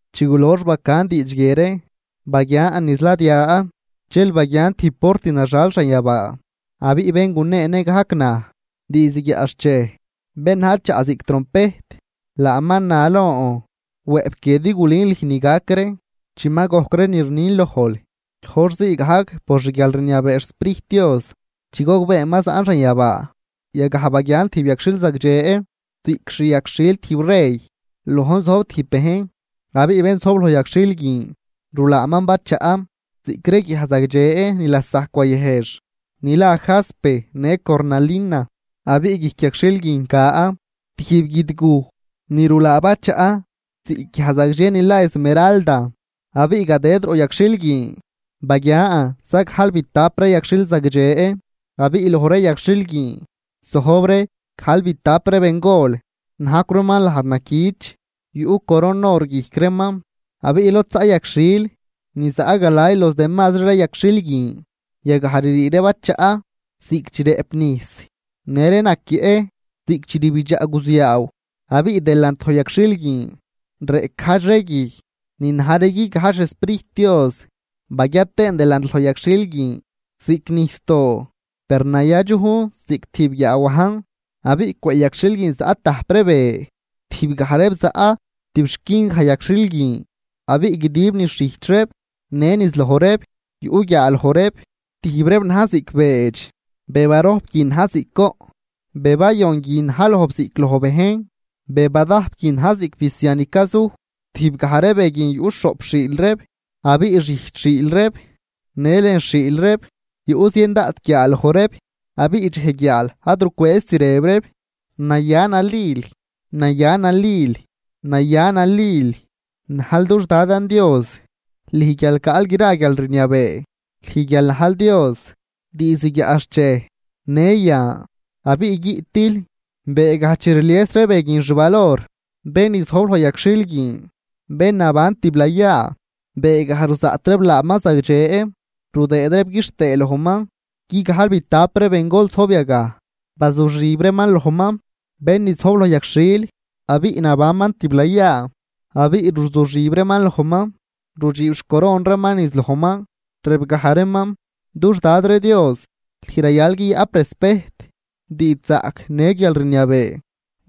Chi gulox bacan diidx guie ree, baguian niz ladia dxel baguian tijb port naxal xanyabaa. Abiꞌ bén guneenë gajc naj diizd guiaꞌxchej bén na̱j chaꞌ ziꞌc trompejt, laaman na lon: ―Wëꞌp guie din gulün lüj ni gac ree chi ma gojc ree ni rnin lojl. Loj hor zii gajc por xguialrniabee xSprijt Dios, chi gogbeen ma zaꞌn xanyabaa yagaj baguian tijb yagxhil zagdxe ziꞌc xi yagxhil tijb rey, lojn zojb tijb bejn. Abiꞌ bén zojb loj yagxhil guin rulaaman bachaꞌ ziꞌc ree guiaj zagdxe ni lasajc wayëjx, ni la jaspe në cornalina. Abiꞌ guijc yagxhil guin ca tijb guidguj ni rulaa bachaꞌ ziꞌc guiaj zagdxe ni la esmeralda. Abiꞌ gadëd roꞌ yagxhil guin baguian zagajlbitap ree yagxhil zagdxe abiꞌ loj ree yagxhil guin zojb ree gajlbitap ree bengol najcw reeman lajd naquich yuꞌ coron or guijc reeman. Abiꞌ lod zaꞌ yagxhil ni zaꞌ galay los demasri ree yagxhil guin, yagaj ririi ree bachaꞌ ziꞌc chi rëꞌp nijs në ree naquieꞌ ziꞌc chi rbidxaꞌ guziaaw. Abiꞌ delant loj yagxhil guin reꞌc gajdx ree guij ni na̱j ree guigajdx xSprijt Dios. Baguia tëën delant loj yagxhil guin ziꞌc nijsdoo, per nayadxujn ziꞌc tijb guiaawajn. Abiꞌ cwëꞌ yagxhil guin zaꞌ tajp ree be, tijb gaj reeb zaꞌ tib xquin gaj yagxhil guin abiꞌ guidib niz xijch reeb në niz loj reeb yuꞌ guiaaloj reeb. Tijb reeb na̱j ziꞌc beedx, be barojp guin na̱j ziꞌc goꞌn, be bayon guin na̱j lojb ziꞌc loj bejn, be badajp guin na̱j ziꞌc bisia ni cazuj. Tijb gaj ree be guin yuꞌ xhoꞌp xhiil reeb, abiꞌ xijch xhiil reeb në lën xhiil reeb yuꞌ zien daꞌt guiaaloj reeb. Abiꞌ dxej guiaal ad rucwëëzt rëb reeb: Naya nalil, naya nalil naya nalil najl dux Dadan Dios, lüj guial caꞌl gra guialrniabee, lüj guial najl Dios diizd guiaꞌxchej në yan abiꞌ guiꞌtil. Beegaj chi rlies ree be guin xvalor bén ni zojb loj yagxhil guin, bén naban tiblayaa, beegaj ruzaꞌt reeb laaman zagdxe rudëëd reeb quixtëë lojman, guigajlbitap ree bengol zojb yagaj, bazuxib reeman lojman, bén ni zojb loj yagxhil abiꞌ nabanman tiblayaa, abiꞌ ruzuxib reeman lojman rudxiib xcoron reeman niz lojman, rëbgaj reeman: Dux Dad ree Dios, lüj rayal guiyaꞌp respejt, diidxzaꞌc në guialrniabee.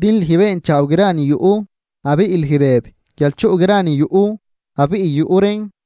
Din lüj beenchaaw gra ni yuꞌ abiꞌ lüj rëb guial chuꞌ gra ni yuꞌ, abiꞌ yuꞌ reen.